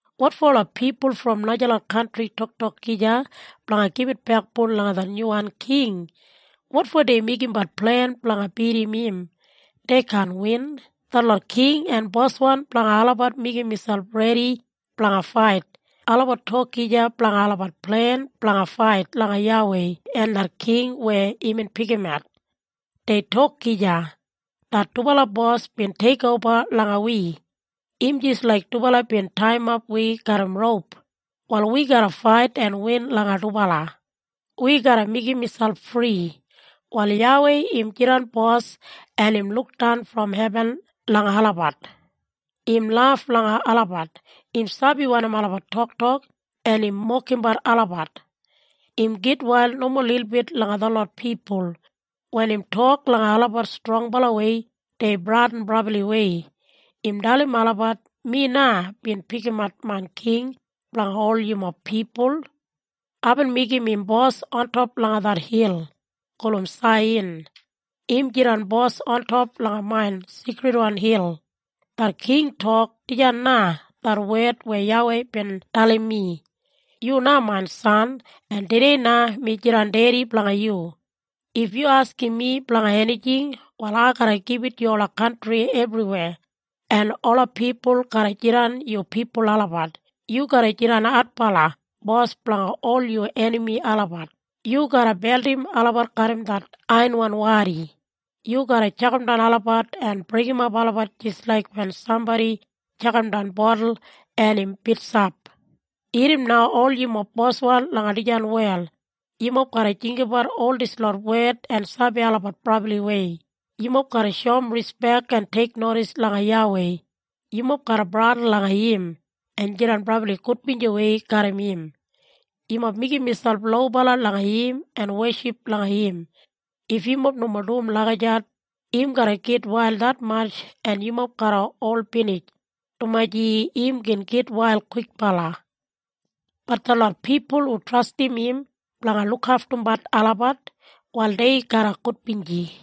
Wotfo ola pipul brom najalot kantri toktok gija blanga gibit bekboun langa det nyuwan king? Wotfo dei meigimbat plen blanga bidim im? Dei kaan win. Detlot king en boswan blanga olabat meigim miselp redi blanga fait. Olabat tok gija blanga olabat plen blanga fait langa YAWEI en det king weya imbin pikimat. Dei tok gija, “Det dubala bos bin teikoba langa wi. Im jis laik dubala bin taiyimap wi garram roup. Wal wi garra fait en win langa dubala. Wi garra meigim miselp fri.” Wal YAWEI im jidan bos en im lukdan brom hebin langa olabat. Im laf langa olabat. Im sabi wanim olabat toktok, en im mokimbat olabat. Im gitwail nomo lilbit langa detlot pipul. Wen im tok langa olabat strongbalawei dei bradin brabliwei. Im dalim olabat, “Mi na, bin pikimat main king blanga ol yumob pipul. Aibin meigim im bos ontop langa det hil gulum Saiyan. Im jidan bos ontop langa main seikridwan hil.” Det king tok, “Dijan na det wed weya YAWEI bin dalim mi. ‘Yu na main san, en tudei na mi jidan dedi blanga yu. If yu askim mi blanga enijing, wal ai garra gibit yu ola kantri ebriweya, en ola pipul garra jidan yu pipul olabat. Yu garra jidan adbala bos blanga ol yu enami olabat. Yu garra beldim olabat garram det aiyanwan wadi. Yu garra tjakamdan olabat en breikimap olabat jis laik wen sambodi tjakamdan botul en im bitsap.’” Irrim na ol yumob boswan langa dijan wel. Yumob garra jinggabat ol dislot wed en sabi olabat brabliwei. Yumob garra shoum rispek en teiknodis langa YAWEI. Yumob garra bradin langa im, en jidan brabli gudbinjiwei garram im. Yumob meigim miselp lobala langa im en weship langa im. If yumob nomo dum lagijat, im garra gitwail detmatj en yumob garra ol binij, dumaji im gin gitwail kwikbala. Bat detlot pipul hu trastim im blanga lukaftumbat olabat, wal dei garra gudbinji.